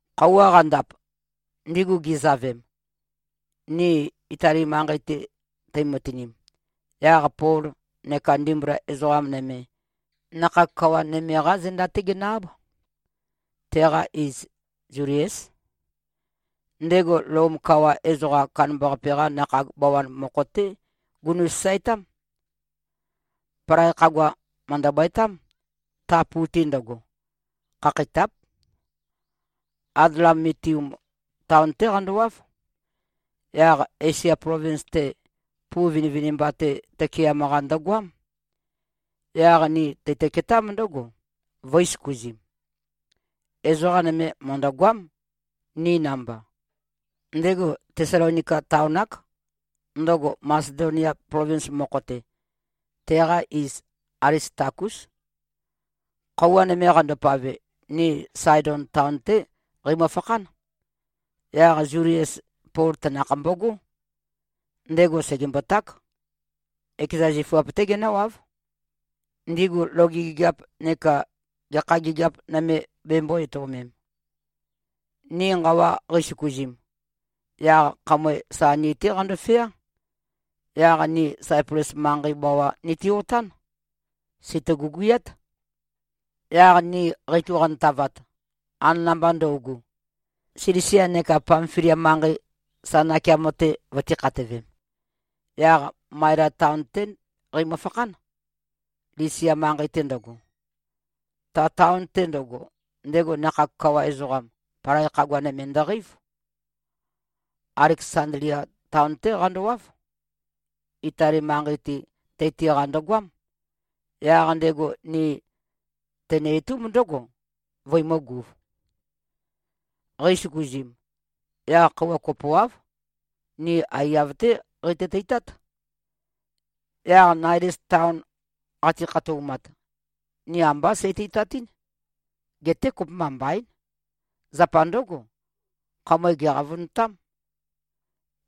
Khøuwa qandap, ndigu gizavem, ni Itali manqei-te teimøtinim, yaq Pol neka ndimbula ezoqa nøme, nakhag kawa nøme-qá zenda-té ginø-áb. Teqa iz Zuliés. Ndego Lom kawa ezoqam kandambaqape-qa nakhag bawan mokho-té gunu꞉-sasaetám. Palai khagua mø̀ndøbøetám, ta pu-te ndøgo. Khakheitáp. Adlamitium taon-té qandowáv. Yaq Esia plovins-te, pu vinivinimba-te tøkeam-qa ndøgoám. Yaq ni teitø-ketámb ndǿgo, vø̄i-søkuzim. Ezoqa nøme mø̀ndøgoám, ni namba. Ndego Tesalonika taon-ák, ndøgo Masedonia plovins mokho-te. Teqa iz Alistakús. Khøuwa nøme qandopave, ni Saedon taon-té qeimø-fakhán. Yaq Zulies, Pol tanakh mbogó. Ndego sègemboták. Ekeza zifuap-té genǿwáv, ndigu loge gigiap neka gekha gigiap nøme bembō-etøomem. Ni nqawa qeisøkuzim, yaq khamøe sa ni-té qandofeá. Yaq ni Saiples manqei bawa niti-otán. Sèitø-guguyát. Yaq ni qeitu-qantavat, anana-mba ndøugu, Silisia neka Pamfilia manqei sa nakeamo-te vøtīkhatøvem, yaq Maela taon-té qeimø-fakhán, Lisia manqei-te ndøgo. Ta taon-te ndøgo, ndego nakhag kawa ezoqam, palai khagua nøme ndøqeív. Aleksandlia taon-té qandowáv. Itali manqei-te teiti-qa ndøgoám. Yaq ndego ni tenø-itúmb ndǿgo, vøimø̄guv. Qeisøkuzim, yaq khøuwa kopoáv, ni aiyav-té qeitø-teitát. Yaq Naides taon qati-khatoumat, ni ambá seiteitatɨ́n. Geté kopømba mbaín. Zapa ndǿgo, khamøe gèqavønotám.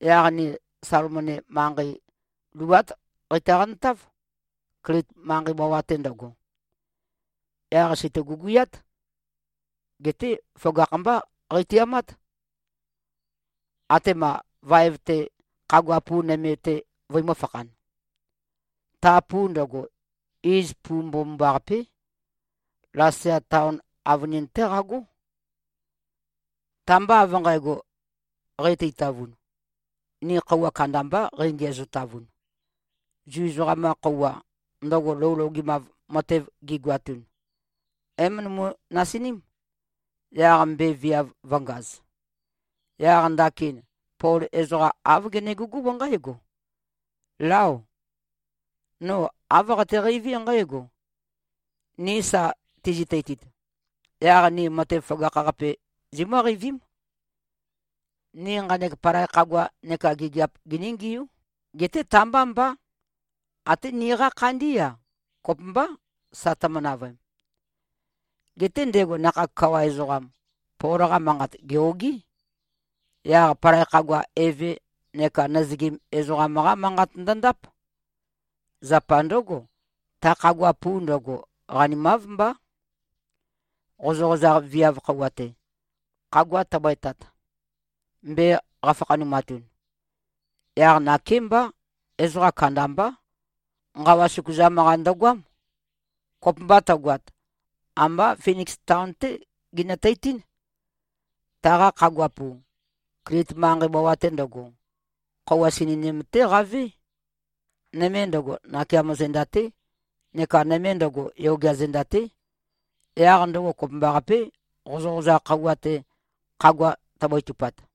Yaq ni Salmone manqei luát qeitø-qantáv, Klit manqei bawa-te ndøgo. Yaq sèitø-guguyát. Geté føgakh-mbá qeitiamát, atema vaev-te khagua pu nøme-te vøimø̄-fakhan. Ta pu ndøgo, iz Pu Mbomambaqapé. Lasea taon avønin-té qagó. Ta-mba av nqægo qati-teitavun, ni khøuwa kandambá qeingiæzotavun. Zu ezoqam-qa khøuwa, ndøgo lou logemav matev gigoatun, é-møndømu-nasiním, yaq mbe viav vø̄ngaz. Yaq ndakin Pol ezoqa āv genegugúb nqǽgo, “Láo. No āv qateqeiví nqǽgo: Ni sa tizi-teitit, yaq ni matev føgakh-qape zimǿqeivím. Ni nqanek palai khagua neka gigiap giníngiú. Geté ta-mbá mbá. Até niqá khandí-a, kopømbá, sa tømø-navøem.” Geté ndego nakhag kawa ezoqam, Pol-qa manqat gè-ogí. Yaq palai khagua eve neka nøzøgim ezoqam-qá manqat ndøndáp. Zapa ndǿgo, ta khagua pu ndøgo, qanimáv mbá, qozøqozaq viav khøuwa-te, khagua tøbøetat, mbe qafakhanumatun. Yaq nakémbá, ezoqa kandambá, nqawa søkuzam-qa ndøgoám. Kopømba tøgoat, ambá Finiks taon-té ginøteitín. Taqa khagua pu, Klit manqei bawa-te ndøgo, khøuwa sininim-té qavé. Nøme ndøgo, nakeamo zenda-té neka nøme ndøgo, yogea zenda-té. Yaq ndøgo kopømbaqapé, qozøqozaq khøuwa-te, khagua tøbøetupat.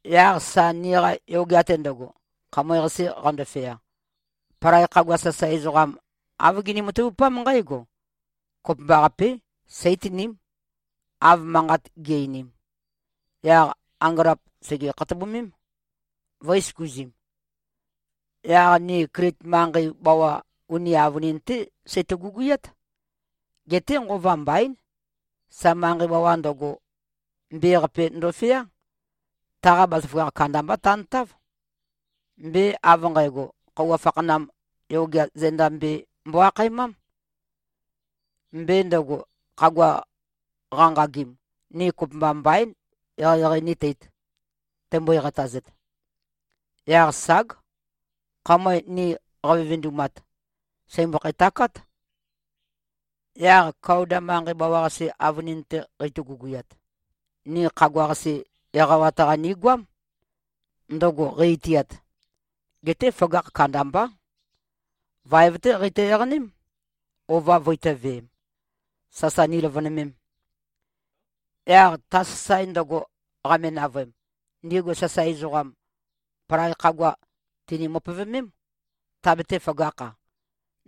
Yaq sa niqa yogea-te ndøgo, khamøe-qase qandofea, palai khagua sasae ezoqam, āv gini-matavupám nqǽgo: Kopømbaqapé. Seítiním, av manqat gi꞉-einim. Yaq angølap sège-khatobumím, vø̄i-søkuzim. Yaq ni Klit manqei bawa uni avønin-té seitø-guguyát. Geté nqova mbaín, sa manqei bawa ndøgo, mbe-qape ndofeá. Taqa bazaføgakh kandamba tantáv. Mbe av nqægo, Khøuwa Fakhanam Yogea Zenda Mbe mbo-akhaemám. Mbe ndøgo, khagua qanqagim, ni kopømba mbaín, eqeieqei níteīt, teimbøe-qatazet. Yaq ság. Khamøe ni qavevendumat, sèimbøkhæ-takát. Yaq Kauda manqei bawa-qase avønin-te qeito-guguyat, ni khagua-qase eqawat-qa nigoám, ndøgo qei-itiat. Geté føgakh kandambá. Vaev-té qeitø-eqaném, ova vøitō-veem, sasa niløvønømem. Yaq ta sasae ndøgo qame-navøem, ndigu sasae ezoqam, palai khagua tìni-møpøvømém, tabetē-føgakh-a,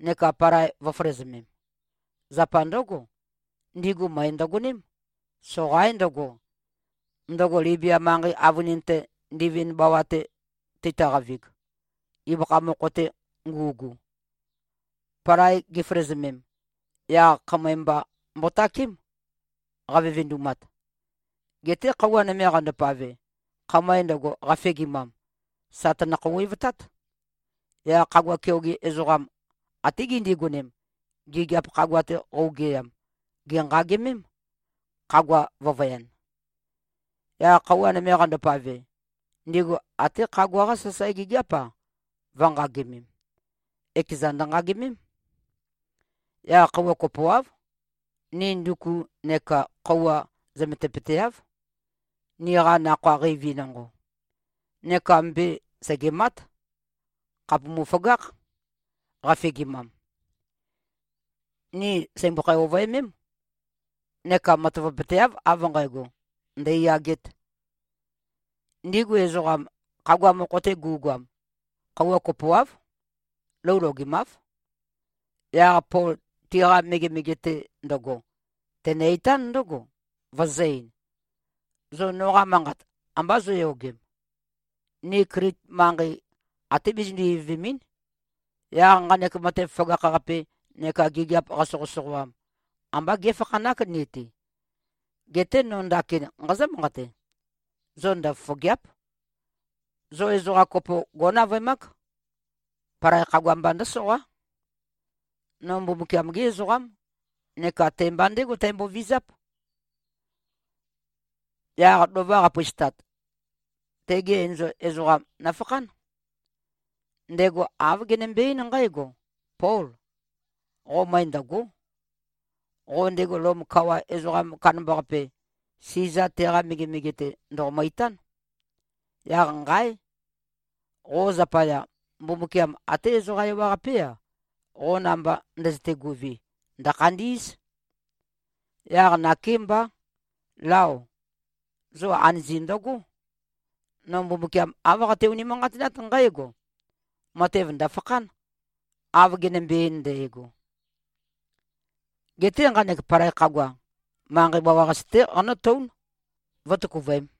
neka palai vø̄føløzømem. Zapa ndǿgo, ndigu møe ndøgoném. Soqaín ndøgo, ndøgo Libia manqei avønin-te, ndivind bawa-te teitø-qavig, ibøkha mokho-te ngu꞉gu. Palai giføløzømem, yaq khamøe mba mbotakém, qavevendumat. Geté khøuwa nøme qandopave, khamøe ndøgo qafegimam, sà tønø-khouwevtát. Yaq khagua keoge ezoqam, até gindigonem, gigiap khagua-te qøugeyam, gènqagimém, khagua vø̄vøyan. Yaq khøuwa nøme qandopave, ndigu até khagua-qa sasae gigiáp-a, vø̄nqagimem. Ekezan ndø̀nqagimém. Yaq khøuwa kopoáv, ni nduku neká khøuwa zømetupøteáv, niqa nakhoa qeivi nonqo. Neka mbe sègemát. Khàpumu-føgákh, qafegimam. Ni sèimbøkhæ-ovøemém. Neka matavapøteáv, av nqægo, ndèiyagēt. Ndigu ezoqam, khagua mokho-te gu꞉goam, khøuwa kopoáv, lou logemáv. Yaq Pol tiqa megemege-te ndo꞉go, tenø-itán ndǿgo, vøzø̄-ein, “Zo noqa manqat ambá zóyogem. Ni Klit manqei, atē bizindu-ivøvèmɨ᷄n. Yaq nqanek matev føgakh-qape neka gigiap qasoqøsoqoam, ambá gé꞉fakhanák ni-te. Geté no ndakin nqazǿ-manqate. Zo ndøfofògea᷄p. Zo ezoqa kopo gó꞉navøemák. Palai khagua mba ndǿsoqá. No Mbumbukiam-gé ezoqám, neka te-mba ndégo tæmbovizáp. Yaq lova qapøistat, tege enzol ezoqam nøfakhán. Ndego āv genømbe-eín nqǽgo, ‘Pól. Qo møe ndø̀go᷄. Qo ndego Lom kawa ezoqam kandambaqape, Siza, teqa megemege-te, ndòqomø-itán. Yaq nqáe! Qo zapaya, Mbumbukiam até ezoqa ewaqapé-a, qo namba ndøzøte-guvi, ndø̀khandí꞉z.’ Yaq nakémbá, lao, zo anøzi ndøgó. No Mbumbukiam, āv qate-unimanqatinát nqǽgo: Matev ndø̀fakhán, av genømbe-ein ndægo. Geté nqanek palai khagua, manqei bawa-qase-té qanótǿun, vǿtøkuvøēm.”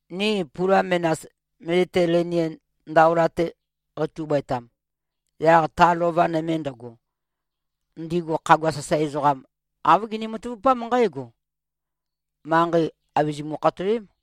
Ni pula menas, Meditelenien ndaola-te qeitu-bøetam, yaq ta lova nøme ndøgo, ndigu khagua sasae ezoqam, āv gini-matavupám nqǽgo: Manqei àbizimu-khatoém.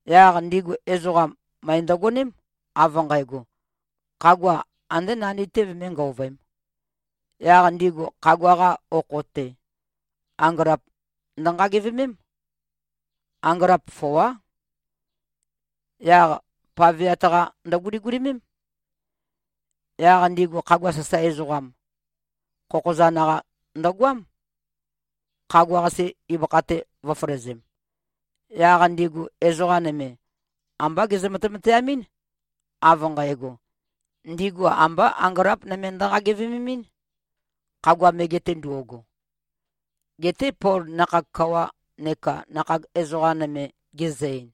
Yaq ndigu ezoqam, møe ndøgoném, av nqægo, khagua andé nandi-té vømé-ngøovøēm. Yaq ndigu khagua-qa okho-te, angølap ndønqagivemém. Angølap foá. Yaq paveat-qa ndøguligulimém. Yaq ndigu khagua sasae ezoqam, khokhozan-qa ndøgoám, khagua-qase ibøkha-te vø̄føløzem. Yaq ndigu ezoqa nøme, ambá gezø-matemateamɨ́n, av nqægo, ndigu ambá angølap nøme ndønqagevememɨ́n, khagua mege-te ndo꞉go. Geté Pol nakhag kawa neka nakhag ezoqa nøme gezø-ein,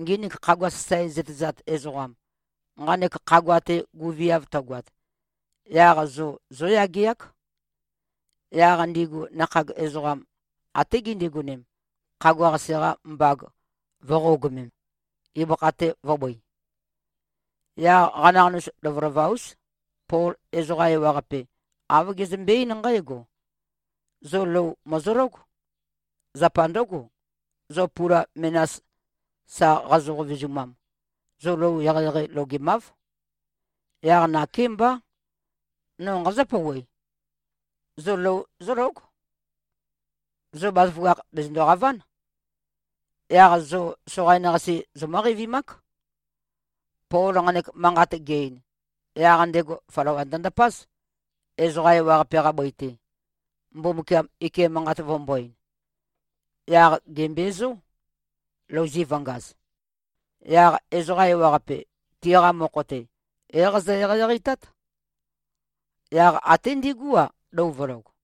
“Nginik khagua sasae zøtezat ezoqam, nqanek khagua-te guveav tøgoat, yaq zo zóyageák.” Yaq ndigu nakhag ezoqam, até gindigonem, khagua-qase-qa mbag vø̄qogømem, ibøkha-te vø̄bøi. Yaq qanaqanus lovølova-ús, Pol ezoqa ewaqape, āv gezømbe-eín nqǽgo, “Zo lou mòzológ. Zapa ndǿgo, zo pula menas sa qazo-qovezumam, zo lou eqeieqei logemáv. Yaq nakémbá. No nqazǿ-pouwe. Zo lou zólóg. Zo bazaføgakh, bèzøndo-qaván. Yaq zo soqain-qase, zomǿ-qeivimák.” Pol nqanek manqat ge-ein, yaq ndego flawa ndøndapáz, ezoqa ewaqape-qa bøi-te, Mbumbukiam ike manqat vømbō-ein. Yaq gèmbezó, louzi vø̄ngaz. Yaq ezoqa ewaqape, tiqa mokho-te, é-qazø-eqeieqeitát. Yaq até ndigú-a, lou vø̄log.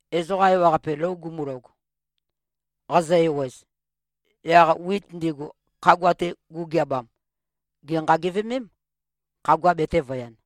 Ezoqa ewaqape lou gumulog, qazø-ewez, yaq wit ndigu, khagua-te gu꞉geabam, gènqagivemém. Khagua betēvøyan.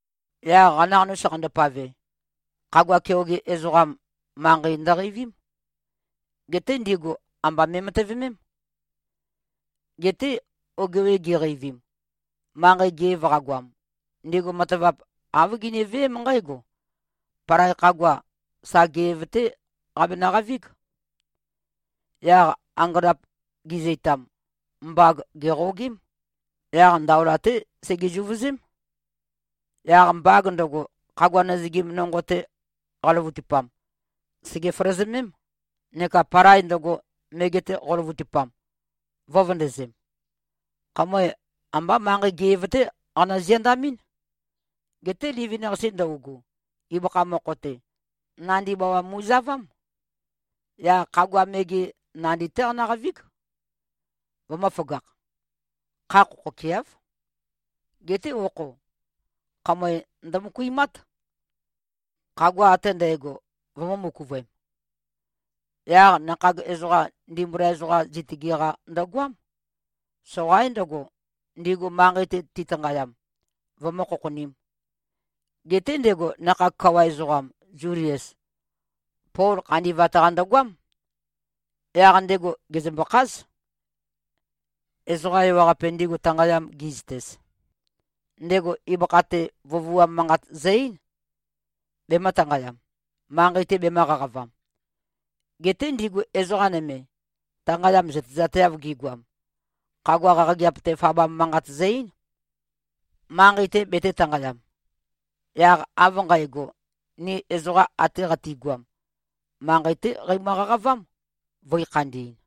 Yaq qanaqanus qandopave, khagua keoge ezoqam, manqei ndøqeivím. Geté ndigu amba me꞉matøvemém. Geté ogewe giqeivim, manqei ge꞉v qagoam, ndigu matavap, āv giniveém nqǽgo: Palai khagua, sa ge꞉v-té qabenø-qavíg. Yaq angølap gi꞉zøitam, mbag gèqogém. Yaq ndaola-té sege-zuvøzém. Yaq mbag ndøgo, khagua nøzøgim nonqo-te qaløvøtupam, sège-føløzømém, neka palai ndøgo, mege-te qo꞉løvøtupam, vø̄vøndøzem. Khamøe ambá manqei ge꞉v-té qanø-ziandamɨ́n. Geté livin-qase ndøugu, ibøkha mokho-te, nandi bawa mu꞉zavám. Yaq khagua mege, nandi-té qano꞉qavíg, vømø̄føgakh. Kha khokhokeáv. Geté okho, khamøe ndømøkuimát, khagua ate ndægo vømū-møkuvøem. Yaq nakhag ezoqam, ndimbula ezoqam, zitøge-qa ndøgoám. Soqaín ndøgo, ndigu manqei-te titanqayam, vømǿ-khokhonīm. Geté ndego nakhag kawa ezoqam, Zulies, Pol khandi꞉vat-qa ndøgoám. Yaq ndego gèzømbø-kház. Ezoqa ewaqape, ndigu tanqayam gi꞉zøtez, ndego ibøkha-te vøvuam manqat zø-eín, bemø̄-tanqayam, manqei-te bemø̄qaqavam. Geté ndigu ezoqa nøme, tanqayam zøtezateav gigoam, khagua qaqageap-te fabam manqat zø-eín, manqei-te betē-tanqayam. Yaq av nqægo, ni ezoqa ate qatigoam, manqei-té qeimø-qaqavám, vø̄i-khandi꞉n.